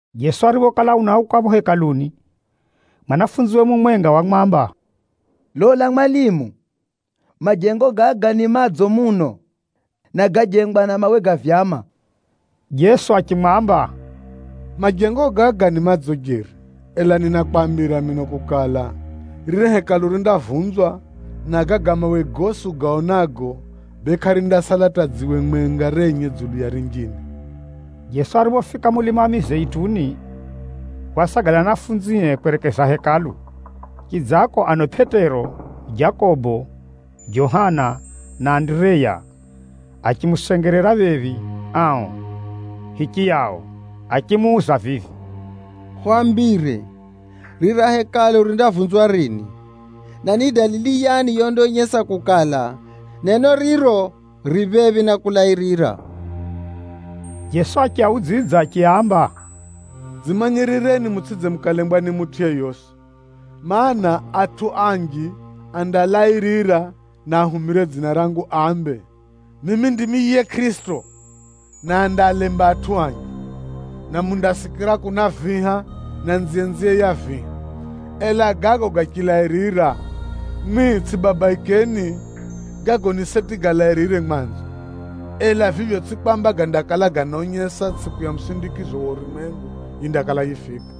Jeso ariphokala unauka phapho Hekaluni, mwanafunziwe mumwenga wamwamba, “Lola mwalimu, majengo gaga ni madzo muno, na gájengwa na mawe ga vyama!” Jeso achimwamba, “Majengo gaga ni madzo jeri, ela ninakwambira mino kukala, riri Hekalu rindavunzwa, na gaga mawe gosi ugaonago, bee kʼarindasala hata dziwe mwenga renye dzulu ya rinjine.” Jeso ariphofika mulima wa Mizeituni, wasagala na anafunzie kwerekeza Hekalu. Chidzako ano Pʼetero, Jakobo, Johana na Andireya achimusengerera phephi ao hichiyao achimuuza vivi, “Hwambire, rira Hekalu rindavunzwa rini? Na ni dalili yani yondaonyesa kukala, neno riro ri phephi na kulairira?” Jeso achiaudzidza achiaamba, “Dzimanyirireni mutsʼidze mukalembwa ni mutʼu yeyosi. Maana, atʼu anji andalairira na ahumire dzina rangu ambe, ‘Mimi ndimi yiye Kʼirisito,’ na andaalemba atʼu anji. Na mundasikira kuna viha, na nziyenziye ya viha. Ela gago gachilairira, mwimwi tsʼibabaikeni. Gago ni seti galairire mwanzo, ela vivyo tsʼivyo kwamba gandakala ganaonyesa tsʼiku ya musindikizo wa urumwengu yindakala yifika.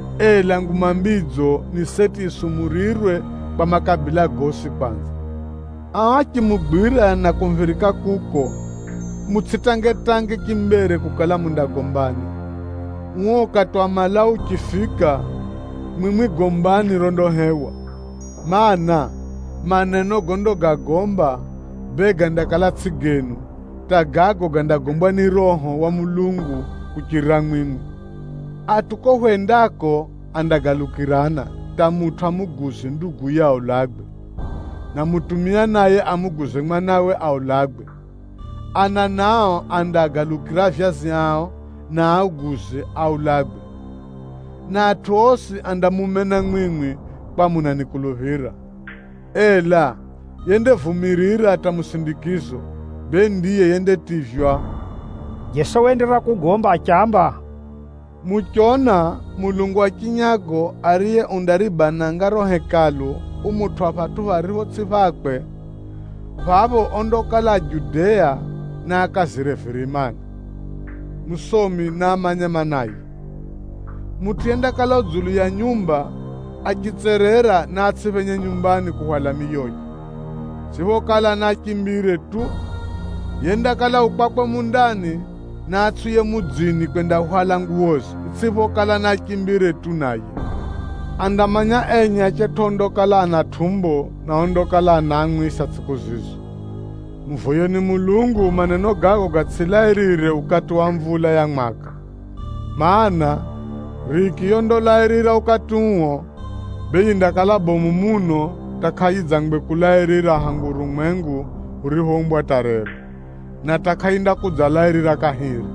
Ela Nguma Mbidzo, ni seti yisumurirwe kwa makabila gosi kwanza. Ao achimugwira na kumuphirika kuko, mutsʼitangetange chimbere kukala mundagombani. Uo ukati wa malau uchifika, mwimwi mundafunulirwa ra kugomba, mana, maneno gondagagomba, bee gandakala tsʼigo genu, hata gago gandagombwa ni yiye Roho wa Mulungu kuchirira mwimwi. Atʼu kuko hwendako andagalukirana hata mutʼu amuguze nduguye mwenye aulagwe, na bemutʼu naye amuguze mwanawe mwenye aulagwe. Ana nao andaagalukira avyazi ao na aaguze aulagwe, na atʼu osi andamumena mwimwi, kwakukala munanikuluphira. Ela yendavumirira hata musindikizo, bee ndiye yendativywa.” Jeso waenderera kugomba achiamba, “Muchona mulungu wa chinyago ariye undaribananga riro Hekalu, umutwʼa phatʼu pharipho tsʼipho phakwe, phapho ondakala a Judea, naakazire virimani. (Musomi naamanye maanaye!) Mutʼu yendakala u dzulu ya nyumba, achitserera naatsʼiphenye nyumbani kuhwala miyoye, itsʼiphokala naachimbire tu. Yendakala u kwakwe mundani, naatsʼiuye mudzini kwendahwala nguwoze, itsʼiphokala naachimbire tu naye. Andamanya enye achetʼu ondakala ana tʼumbo na ondakala anaamwisa tsʼiku zizo! Muvoyeni Mulungu maneno gago gatsʼilairire ukati wa mvula ya mwaka! Maana, riki yondalairira ukati uo, bee yindakala bomu muno hata kʼayidzangwe kulairira hangu Mulungu ariphoumba urumwengu hata rero. Na hata kʼayindakudzalairira kahiri.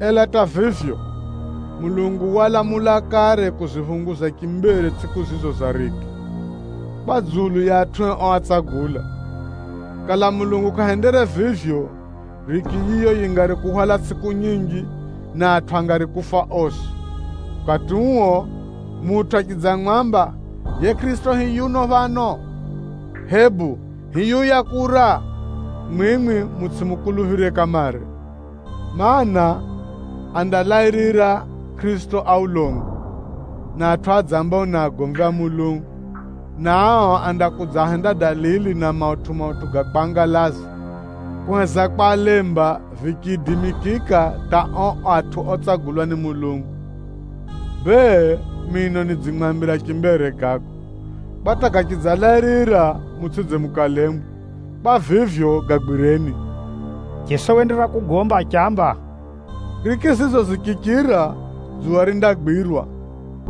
Ela hata vivyo, Mulungu walamula kare kuziphunguza chimbere tsʼiku zizo za riki, kwa dzulu ya atʼue oatsagula. Kala Mulungu kʼahendere vivyo, riki yiyo yingari kuhwala tsʼiku nyinji, na atʼu angari kufa osi. “Ukati uo, mutʼu achidzamwamba, ‘Yiye Kʼirisito hiyu phano!’ Hebu ‘Hiyuya kura!’ Mwimwi mutsʼimukuluphire kamare. Maana, andalairira Kʼirisito a ulongo, na atʼu adzambao ni agomvi a Mulungu, na ao andakudzahenda dalili na mautʼu-mautʼu ga kwangalaza, kuheza kwalemba vichiidimikika hata ao atʼu otsagulwa ni Mulungu. Bee, mino nidzimwambira chimbere gago, kwa hata gachidzalairira, mutsʼidze mukalembwa. Kwa vivyo, gagwireni!” Jeso waenderera kugomba achiamba, “Riki zizo zichichira, ‘dzuwa rindagwirwa,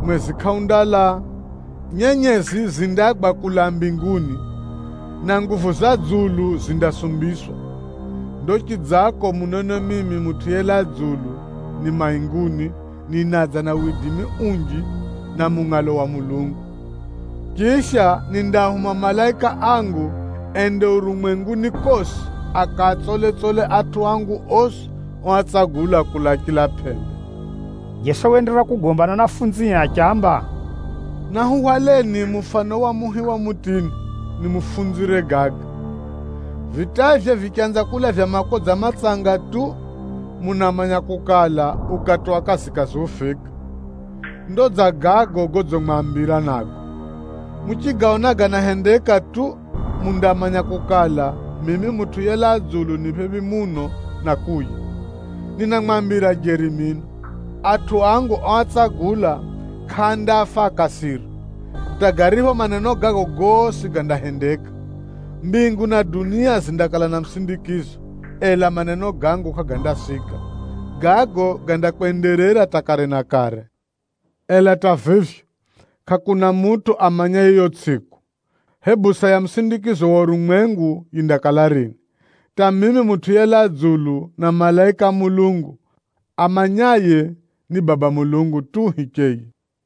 mwezi kʼaundaala, nyenyezi zindagwa kulaa mbinguni, na nguvu za dzulu zindasumbiswa.’ “Ndo chidzako, munone mimi Mutʼu yelaa dzulu, ni mainguni ninadza na widimi unji na mungʼalo wa Mulungu. Chisha, nindaahuma malaika angu ende urumwenguni kosi, akaatsole-tsole atʼu angu osi oatsagula kulaa chila pʼembe.” Jeso waenderera kugomba na anafunzie achiaamba, “Nahuhwaleni mufano wa muhi wa mutini, nimufunzire gaga. Vitaivye vichanza kulavya makodza matsanga tu, munamanya kukala, ukati wa kazikazi ufika. Ndo dza gago godzimwambira nago. Muchigaona ganahendeka tu, mundamanya kukala, mimi Mutʼu yelaa dzulu ni phephi muno na kuuya. Ninamwambira jeri mino, atʼu angu oatsagula kʼaandafa akasira, hata garipho maneno gago gosi gandahendeka. Mbingu na dunia zindakala na musindikizo, ela maneno gangu kʼagandasika. Gago gandakwenderera hata kare na kare. “Ela hata vivyo, kʼakuna mutʼu amanyaye yiyo tsʼiku, hebu saa ya musindikizo wa urumwengu yindakala rini, hata mimi Mutʼu yelaa dzulu na malaika a Mulungu. Amanyaye ni Baba Mulungu tu hicheye.”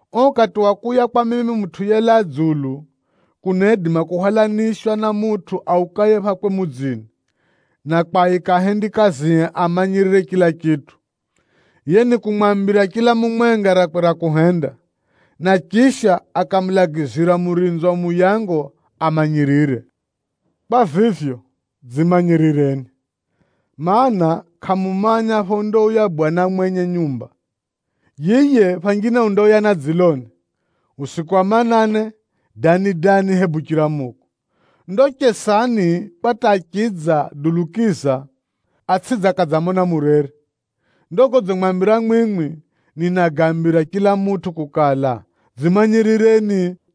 Uo ukati wa kuuya kwa mimi Mutʼu yelaa dzulu, kunaidima kuhwalanishwa na mutʼu aukaye phakwe mudzini, na kwaika ahendikazie amanyirire chila chitʼu. Yiye nikumwambira chila mumwenga rakwe ra kuhenda, na chisha akamulagizira murinzi wa muyango amanyirire. Kwa vivyo, dzimanyirireni, mana, kʼamumanya phondauya Bwana mwenye nyumba. Yiye phanjine undauya na dziloni, usiku wa manane, dani-dani hebu chiramuko. Ndo chesani, kwa hata achidza dulukiza, atsʼidze akadzamona murere. Ndo godzimwambira mwimwi, ninagaambira chila mutʼu kukala, dzimanyirireni.”